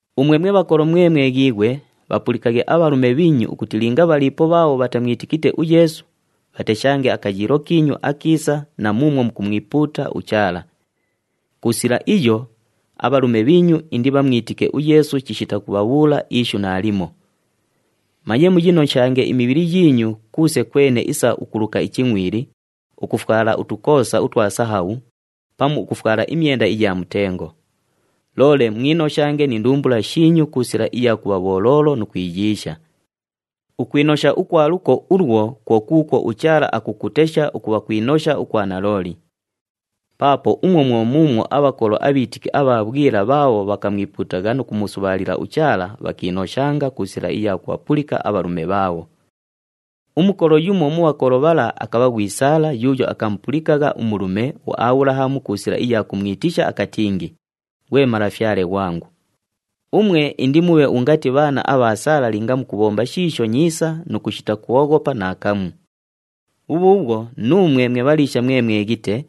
Umwe mwe bhakolo mwe mweghiighwe, bhapulikaghe abhalume bhiinyu ukuti linga bhaliipo bhaabho bhatamwitikite uYeesu, bhateshange akayiilo kiinyu akiisa na muumwo mukumwipuuta uChaala. Ku sila iyo, abhalume bhiinyu indibhamwitike uYeesu chishita kubhabhuula ishu naalimo. Manye muyinoshange imibhili yiinyu kuuse kwene isa ukuluka ichingʼwili, ukufwala utukoosa utwa sahabhu, pamu ukufwala imyenda iya mutengo. Loole mwinoshange ni ndumbula shiinyu ku sila iya kubha bholoolo nu kwiyiisha. Ukwinosha ukwa luko ulwo kwo kuukwo uChaala akukutesha ukubha kwinosha ukwa nalooli. Paapo umwo mwo muumwo abhakolo abhiitiki abha bhwila bhaabho bhakamwipuutagha nu kumusubhaalila uChaala, bhakiinoshanga ku sila iya kubhapulika abhalume bhaabho. Umukolo yumo mu bhakolo bhala akabha ghwi Saala yuuyo akamupulikagha umulume uAbhulahamu ku sila iya kumwitisha, akatingi, “Ghwe malafyale ghwangu.” Umwe indimubhe ungati bhaana abha Saala linga mukubhomba shiisho nyiisa nu kushita kwoghopa naakamu. Bhubhuubhwo nuumwe mwe bhaliisha mwe mweghite,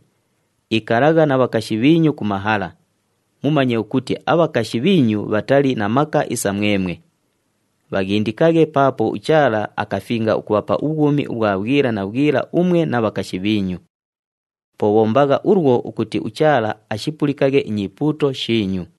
ikalagha na bhakashi bhiinyu ku mahala, mumanye ukuti abhakashi bhiinyu bhatali na maka isa mwemwe. Bhaghindikaghe paapo uChaala akafinga ukubhapa ubhwumi ubhwa bhwila na bhwila umwe na bhakashi bhiinyu. Po bhombagha ulwo ukuti uChaala ashipulikaghe inyipuuto shiinyu.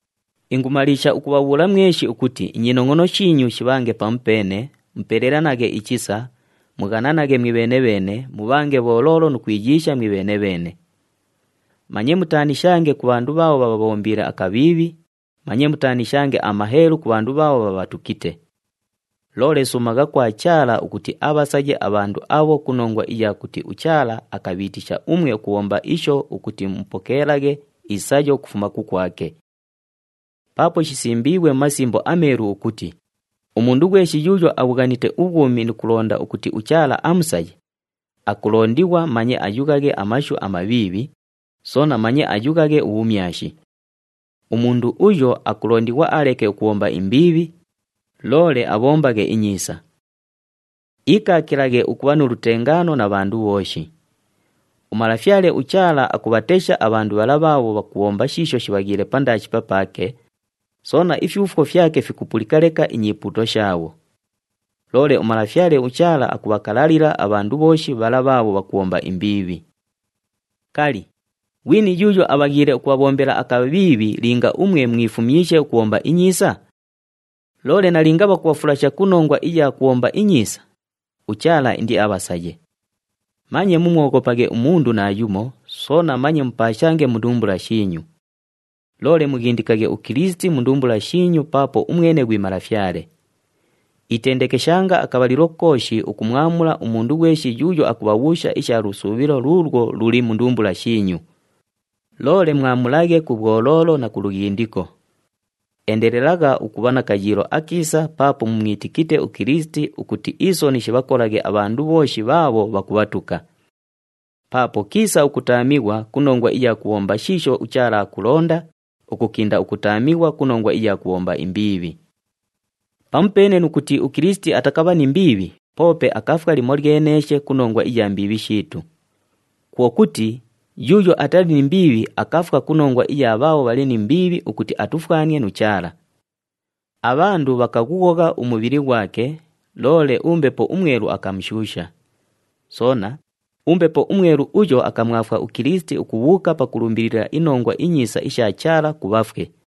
Ingumaliisha ukubhabhuula mweshi ukuti inyinongʼono shiinyu shibhange pamupeene, mupelelanaghe ichisa, mughananaghe mwibheene-bheene, mubhange bholoolo nu kwiyiisha mwibheene-bheene. Manye mutaanishange ku bhandu bhaabho bhabhabhombiile akabhiibhi, manye mutaanishange amaheelu ku bhandu bhaabho bhabhatukite. Loole suumagha kwa Chaala ukuti abhasaye abhandu abho ku nongwa iya kuti uChaala akabhiitisha umwe ukubhomba isho ukuti mupokeelaghe isayo ukufuma kukwake. Paapo shisimbiighwe mu Masimbo aMeelu ukuti, “Umundu ghweshi yuuyo abhughanite ubhwumi nu kulonda ukuti uChaala amusaye, akulondighwa manye ayughaghe amashu amabhiibhi, soona manye ayughaghe ubhumyashi. Umundu uyo akulondighwa aleke ukubhomba imbiibhi, loole abhombaghe inyiisa. Iikaakilaghe ukubha nu lutengaano na bhandu bhooshi. UMalafyale uChaala akubhatesha abhandu bhala bhaabho bhakubhomba shiisho shibhaghiile pandaashi papaake, soona ifyufwo fyake fikupulika leka inyipuuto shaabho. Loole uMalafyale uChaala akubhakalalila abhandu bhooshi bhala bhaabho bhakubhomba imbiibhi.” Kali, ghwini yuuyo abhaghiile ukubhabhombela akabhiibhi linga umwe mwifumyishe ukubhomba inyiisa? Loole nalinga bhakubhafulasha ku nongwa iya kubhomba inyiisa, uChaala indiabhasaye. Manye mumwoghopaghe umundu naayumo, soona manye mupaashange mu ndumbula shiinyu. Loole mughindikaghe uKilisiti mu ndumbula shiinyu paapo umwene ghwi Malafyale. Itendekeshanga akabhalilo kooshi ukumwamula umundu ghweshi yuuyo akubhabhuusha isha lusuubhilo luulwo luli mu ndumbula shiinyu. Loole mwamulaghe ku bhwoloolo na ku lughindiko. Endelelagha ukubha na kayiilo akiisa paapo mumwitikite uKilisiti ukuti isoni shibhakolaghe abhandu bhooshi bhaabho bhakubhatuka. Paapo kiisa ukutaamighwa ku nongwa iya kubhomba shiisho uChaala akulonda, ukukinda ukutaamighwa ku nongwa iya kubhomba imbiibhi. Pamupeene nu kuti uKilisiti atakabha ni mbiibhi poope akafwa limolyeneeshe ku nongwa iya mbiibhi shiitu. Kwo kuti, yuuyo atali ni mbiibhi akafwa ku nongwa iya bhaabho bhali ni mbiibhi ukuti atufwanie nu Chaala. Abhandu bhakaghughogha umubhili ghwake, loole uMbepo uMwelu akamushuusha. Soona, uMbepo uMwelu uyo akamwafwa uKilisiti ukubhuuka pakulumbilila iNongwa iNyiisa isha Chaala ku bhafwe.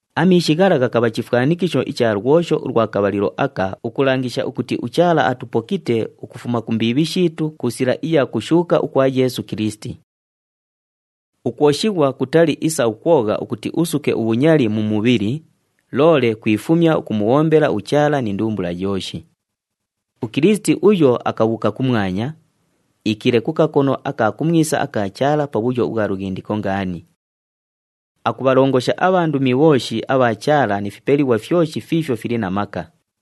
Amiishi ghala ghakabha chifwanikisho icha lwosho ulwa kabhalilo aka, ukulangisha ukuti uChaala atupokite ukufuma ku mbiibhi shiitu ku sila iya kushuuka ukwa Yeesu Kilisiti. Ukwoshighwa kutali isa ukwogha ukuti usuke ubhunyali mu mubhili, loole kwifumya ukumubhombela uChaala ni ndumbula yooshi. UKilisiti uyo akabhuuka kumwanya, iikiile ku kakono aka kumwisa aka Chaala pabhuyo ubhwa lughindiko ngaani. Akubhalongosha abhandumi bhooshi abha Chaala ni fipelighwa fyoshi fiifyo fili na maka.